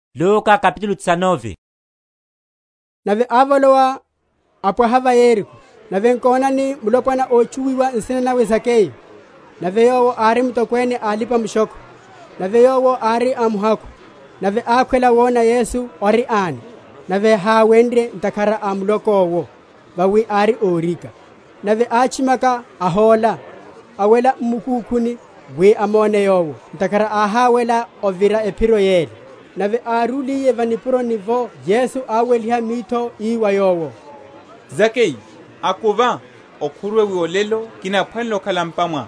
Zakeyu. Nave ávolowa, apwaha va Yeriko. Nave nkonani, mulopwana, ótchuwiwa nsina nawe Zakeyu; nave yowo ári mutokwene a alipa‐mushokho, nave yowo ári amuhakhu. Nave ákhwela wona Yesu ori ani, nave háwenrye, ntakhara a muloko’wo, vawi ári órika. Nave átchimaka, ahóla, awela m’mukúkhuni wi amone Yowo; ntakhara áhawela ovira ephiro yele. Nave árúliye va nipuroni’vo Yesu áweliha mitho ii wa yowo, Zakeyu, akuva, okhuruwe; wi olelo kinaphwanela okhala m’pa mwá.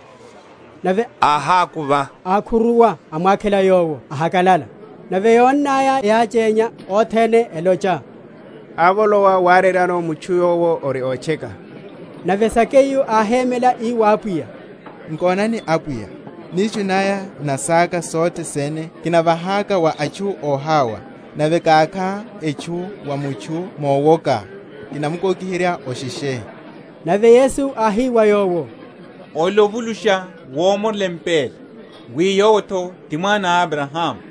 Nave áhakuva, akhuruwa amwakhela Yowo ahakalalaka. Nave yónnaya yáchénya othene, elocha, Ávolowa wareryano mutchu yowo ori ótcheka. Nave Zakeyu áhémela ii wa Apwiya, Nkonani, Apwiya, nishu naya na saka sothe sene kinavahaka wa atchu óhawa; nave kákha etchu wa mutchu mowoka, kinamukokiherya osheshe. Nave Yesu áhi wa yowo, Olelo ovulusha womorela empa ela, wi yowo’tho ti mwana a Abrahamu.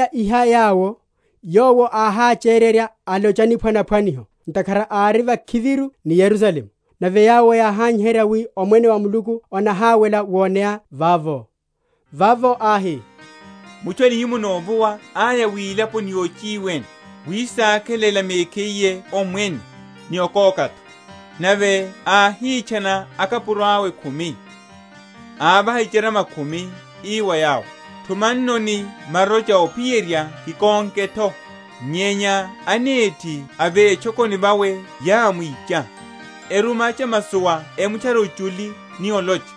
Nave yíwalaya iha yawo, Yowo áhachererya alocha niphwanaphwaniho, ntakhara ári vakhiviru ni Yerusalemu, nave yawo yáhanyiherya wi omwene wa Muluku onahawela woneya vavo. Vavo áhi, Mutchu a nihimo novuwa áya wilaponi yochiwene, wisakhelela mekhiye omwene, ni okoka’tho. Nave áhitchana akapuro awe khumi, ávaha icharama khumi, ii wa yawo, thumannoni marocha ophiyerya kikonke’tho. Nyenya anethi a vetchokoni vawe yámwicha, eruma achamasowa emutchare ochuli ni olocha,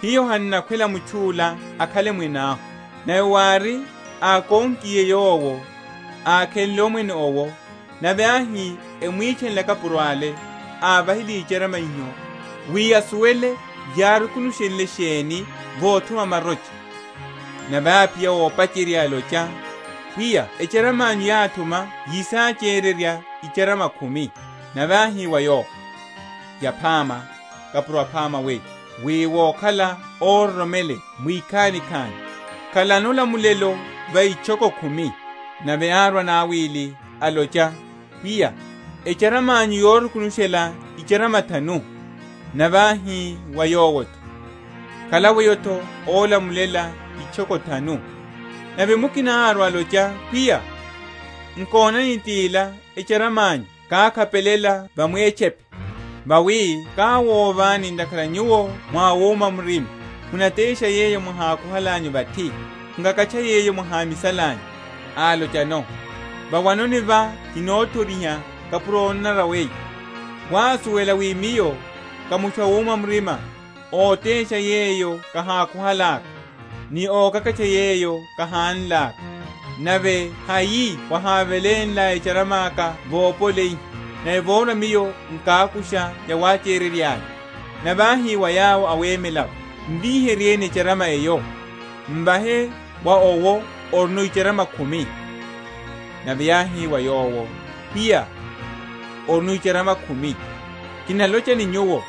Hiyo han’nakhwela mutchu’la akhale mwene ahu. Nave wári, ákonkiye yowo, ákhenle omwene owo, nave áhi emwitchanele akapuro ale, ávahiliye icharama iho, wi asuwele yárukunushenle sheni vothuma marocha. Nave áphiya ópacherya, alocha, Pwiya echarama’nyu yáthuma yisachererya icharama khumi. Nave áhi wa yowo, Yaphama, kapuro aphama weyo; wi wokhala óroromeleya mwikhanikhani, khalano olamulelo va itchoko khumi. Nave árwa anawili, alocha, Pwiya, echarama’nyu yorukunushela icharama thanu. Nave áhi wa yowo’tho, Khala weyo’tho ólamulela itchoko thanu. Nave mukina árwa, alocha, Pwiya, nkonani, tila echarama’nyu kákhapelela va mwétchepe: vawi káwovani, ntakhara nyuwo mwá awuma murima: munatesha yeyo mwahákuhalanyu vathi, mukakatcha yeyo mwahámisalanyu. Álochano, Vawanoni vá kinothoriha, kapuro ónanara weyo. Wásuwela wi miyo ká mutchu awuma murima, ótesha yeyo kahákuhalaka, ni ókakatcha yeyo kahánlaka; nave hai wahávelénlá echarama aka vopoleyiha, nave vorwa miyo nkákusha ni yawachererya’ya? Nave áhi wa yawo awemela’vo, M’viheryeni echarama eyo, m’vahe wa owo orino icharama khumi. Nave yáhi wa yowo, Pwiya, orino icharama khumi. Kinalocha ni nyuwo,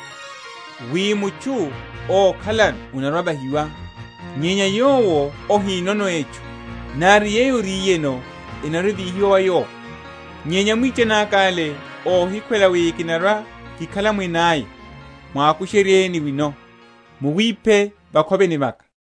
wi, Mutchu ókhalano anarwa‐avahiwa; nyenya wa yowo ahinono etchu, nari yeyo oriyeno enarwa‐evíhiwa wa yowo. Nyenya amwichani aka’le óhikhwela wi kinarwa‐kikhala mwene aya, mwakusheryeni wino, muwiphe vakhoveni vaka.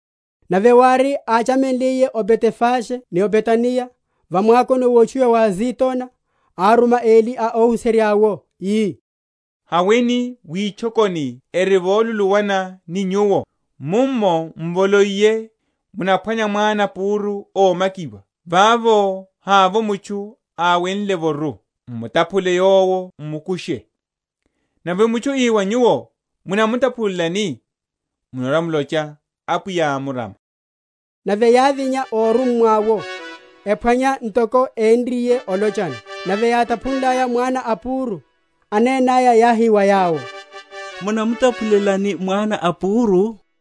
Nave wári, áchamenliye o Betefage ni Betaniya, va mwakoni wotchuwiwa wa Azitona, áruma eli a óhuserya’wo, ii, Haweni witchokoni eri voluluwana ni nyuwo; mummo, m’voloiye, munaphwanya mwana a púru ómakiwa, vavo havovo mutchu áwenle’voru; m’mutaphule yowo m’mukushe. Nave mutchu ii wa nyuwo, Munamutaphulelani? munarwa‐mulocha, Apwiya ámurama. Nave yávinya órummwa’wo, ephwanya ntoko enriye olochano. Nave yátaphunlaya mwana a púru, anenaya yáhi wa yawo, Munamutaphulelani mwana a púru?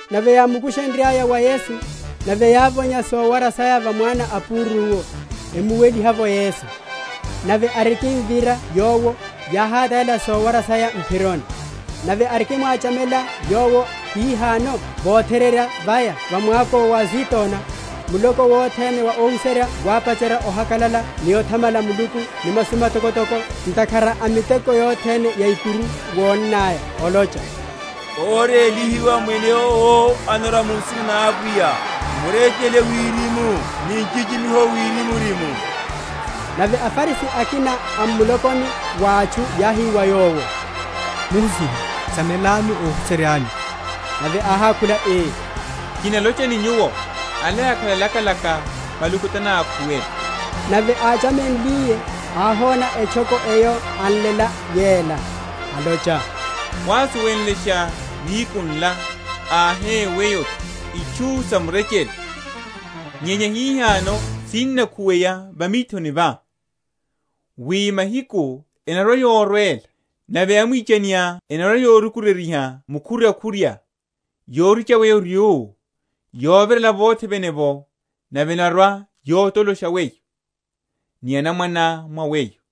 Nave yámukusherya wa Yesu: nave yávonya sowara saya va mwana a púru’wo, emuweliha’vo Yesu. Nave arikimvira Yowo, yáhatalela sowara saya m’phironi. Nave arikimwachamela Yowo hihano votherereya vaya va mwako wa Azitona, muloko wothene wa óhuserya wápacherya ohakalala ni othamala Muluku ni masu matokotoko, ntakhara a miteko yothene ya ikuru wónnaya; olocha, Órélihiwa Mwene owo anarwa mu nsina na Apwiya: Murechele wirimu, ni nchichimiho wirimurimu. Nave aFarisi akina a m’mulokoni wa atchu yáhi wa Yowo, Muhusiha, samelani óhuserya’nyu. Nave áhákhula ii, Kinalocha ni nyuwo, ala yakhala lakalaka maluku tanákhuwele. Nave áchamenliye, áhona etchoko eyo anlela yela, alocha, Wásuwenlesha nihiku nla, ahe weyo’tho, itchu sa murechele! nyenya hihano sinnakhuweya va mithoni vá. Wi mahiku enarwa‐yorwela, nave amwichaniá enarwa‐yorukuryeryiha mukhuryakhurya, yoricha weyo ryú, yovirela vothe vene’vo; nave enarwa‐yotolosha weyo, ni anamwaneá mwa weyo;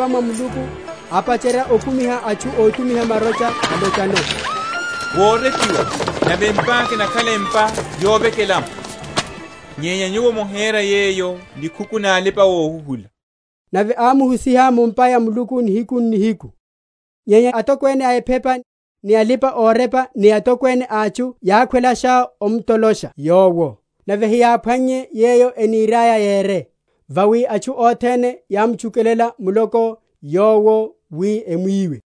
Nave ávolowa mu’mpa ya Muluku, ápacherya okumiha atchu ótumiha marocha, alochano, Worepiwa, Nave empa’ka enakhala empa yovekela’mo; nyenya nyuwo mohera yeyo nikhuku na alipa‐ohuhula. Nave ámuhusiha mu’mpa ya Muluku nihiku n’nihiku. Nyenya atokwene a ephepa, ni alipa‐orepa ni atokwene a atchu yákhwelasha omtolosha Yowo: nave heyáphwannye yeyo eniriaya yere; vawi atchu othene yámtchukela muloko Yowo wi emwiwe.